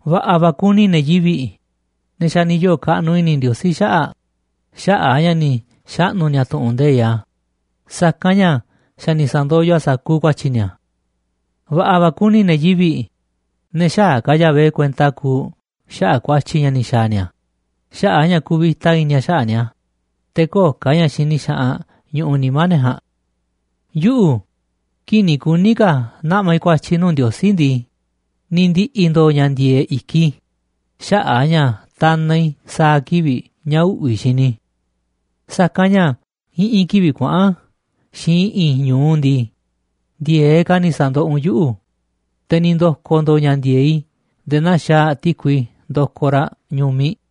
Va̱ꞌa̱ va̱ kuni ne̱ yivi̱ꞌ, ne̱ xa̱ ni̱ yoo̱ kaꞌnuꞌ i̱ni̱ Ndiosí xaꞌa̱ꞌ xaꞌa̱ꞌ a̱ ña̱ ni̱ xaꞌnu̱ ni̱a̱ tu̱ꞌu̱n nde̱iꞌ a̱, sa̱kanꞌ ña̱ xa̱ ni̱ sa̱ndoyoꞌ a̱ sa̱kuuꞌ ku̱a̱tyi̱ ni̱a̱. Va̱ꞌa̱ va̱ kuni ne̱ yivi̱ꞌ, ne̱ xäaꞌ ka̱ Yahvé kuenta kuuꞌ xaꞌa̱ꞌ ku̱a̱tyi̱ ña̱ ni̱ xa̱a̱ ni̱a̱ xaꞌa̱ꞌ ña̱ kuvita i̱ni̱ a̱ xaꞌa̱ꞌ ni̱a̱, te̱ köo̱ꞌ ka̱ ña̱ xini xaꞌanꞌ ñuꞌuꞌ nimá ne̱ ja̱a̱nꞌ. Yuꞌu̱, kii̱ꞌ ni̱ kuní ka̱ naꞌma̱ i̱ ku̱a̱tyi̱ i̱ nuu̱ꞌ Ndiosí ndii, ni̱ ndi̱ꞌi̱ ndo̱o̱ ña̱ ndi̱e̱e̱ꞌ i̱kiꞌ i̱ xaꞌa̱ꞌ a̱ ña̱ tanaꞌ i̱ sa̱a̱ kivi̱ꞌ ña̱ uꞌvi̱ xini i̱. Sa̱kanꞌ ña̱ i̱ꞌi̱n kivi̱ꞌ kuaꞌa̱n xiinꞌ i̱ꞌi̱n ñu̱u ndii, ndi̱e̱eꞌ ka̱ ni̱ sa̱ndoꞌoꞌ u̱nꞌ yuꞌu̱, te̱ ni̱ ndo̱ko̱ ndo̱o̱ ña̱ ndi̱e̱e̱ꞌ i̱ nde̱e̱ naa xaaꞌ ti̱kui ndokoꞌ raꞌ ñu̱miꞌ.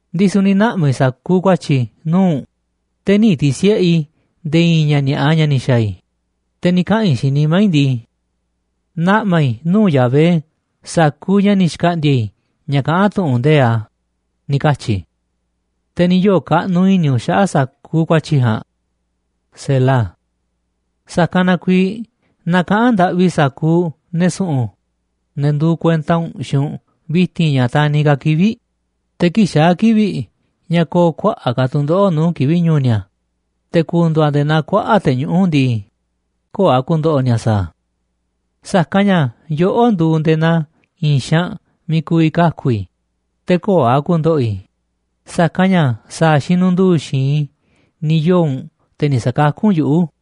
Ndisu̱ ni̱ naꞌma̱ i̱ sa̱kuuꞌ ku̱a̱tyi̱ i̱ nuu̱ꞌ u̱nꞌ, te̱ nï̱ ti̱si̱ꞌe i̱ nde̱e̱ i̱i̱n ña̱ ni̱a̱ꞌa ña̱ ni̱ xa̱a̱ i̱, te̱ ni̱ kaꞌa̱n i̱ xiinꞌ nimá i̱ ndii: “Naꞌma̱ i̱ nuu̱ꞌ Yahvé sa̱kuuꞌ ña̱ ni̱ xkaꞌndi̱a̱ i̱ ña̱ kaꞌán tu̱ꞌu̱n nde̱iꞌ a̱”, ni̱ katyi̱ i̱. Te̱ ni̱ yoo̱ kaꞌnuꞌ i̱ni̱ u̱nꞌ xaꞌa̱ꞌ sa̱kuuꞌ ku̱a̱tyi̱ i̱ ja̱a̱nꞌ. Sa̱kanꞌ na kuiiꞌ na kaꞌa̱n ndaꞌvi sa̱kuuꞌ ne̱ su̱ꞌu̱n, ne̱ nduuꞌ kuenta u̱nꞌ, xiinꞌ u̱nꞌ vi̱ti̱n ña̱ taniꞌ kaa̱ꞌ kivi̱ꞌ, te̱ kii̱ꞌ xaa̱ kivi̱ꞌ ña̱ ko̱o̱ kuaꞌa̱ꞌ ka̱ tu̱ndoꞌo̱ꞌ nuu̱ꞌ kivi̱ꞌ ñu̱u̱ ni̱a̱, te̱ ku̱ndu̱u̱ a̱ nde̱e̱ naa kuaꞌa̱ꞌ te̱ñuꞌu̱ꞌ ndii, köo̱ꞌ a̱ ku̱ndo̱ꞌo̱ ni̱a̱ sa̱a̱ a̱. Sa̱kanꞌ ña̱ yoꞌó nduuꞌ nde̱e̱ naa i̱i̱n xaanꞌ miiꞌ ku̱vi̱ kaku̱ i̱ te̱ köo̱ꞌ a̱ ku̱ndo̱ꞌo̱ i̱, sa̱kanꞌ ña̱ sa̱a̱ xinundu̱u̱ xi̱i̱nꞌ i̱ ni̱ yoo̱ u̱nꞌ, te̱ ni̱ sa̱kakú u̱nꞌ yuꞌu̱.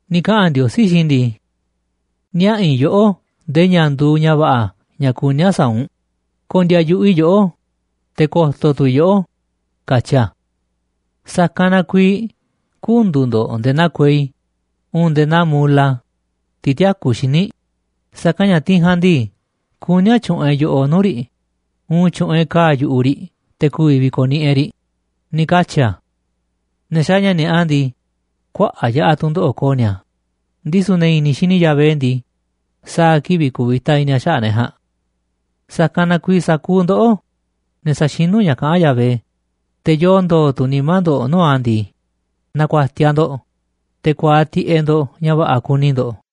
Ni̱ kaꞌa̱n Ndiosí xiinꞌ i̱ ndii: “Niaꞌa̱ i̱ yoꞌó ndee ña̱ nduuꞌ ña̱ va̱ꞌa̱ ña̱ kuní a̱ sa̱a̱ u̱nꞌ, ko̱ndi̱a̱ yu̱ꞌuꞌ i̱ yoꞌó, te̱ ko̱to̱ tu̱ i̱ yoꞌó, katyi̱ a̱. Sa̱kanꞌ na kuiiꞌ kü̱ndu̱u̱ ndo̱ꞌ nde̱e̱ naa kuei uun nde̱e̱ naa mola, tiꞌ tïakú xíniꞌ, sa̱kanꞌ ña̱ tiꞌ ja̱a̱nꞌ ndii, kuní a̱ tyu̱ꞌu̱n e̱ꞌ yo̱ꞌoꞌ nuu̱ꞌ riꞌ uun tyu̱ꞌu̱n e̱ꞌ ka̱a̱ yu̱ꞌuꞌ riꞌ te̱ ku̱vi̱ vi̱ko̱niꞌiꞌ e̱ꞌ riꞌ”, ni̱ katyi̱ a̱. Ne̱ xaaꞌ ña̱ ni̱a̱ꞌa ndii, kuaꞌa̱ꞌ yaꞌa̱ tu̱ndoꞌo̱ꞌ ko̱o̱ ni̱a̱, ndisu̱ ne̱ i̱ni̱ xini Yahvé ndii, sa̱a̱ kivi̱ꞌ kuvita i̱ni̱ a̱ xaꞌa̱ꞌ ne̱ ja̱a̱nꞌ. Sa̱kanꞌ na kuiiꞌ sa̱kuuꞌ ndoꞌó, ne̱ saxinú ña̱ kaꞌán Yahvé, te̱ yoo ndo̱o̱ tu̱ nimá ndo̱ꞌ nuu̱ꞌ a̱ ndii, na̱ku̱a̱tiaꞌ ndo̱ꞌ, te̱ ku̱a̱aꞌ tiꞌeꞌ ndo̱ꞌ ña̱ va̱ꞌa̱ kuni ndo̱ꞌ.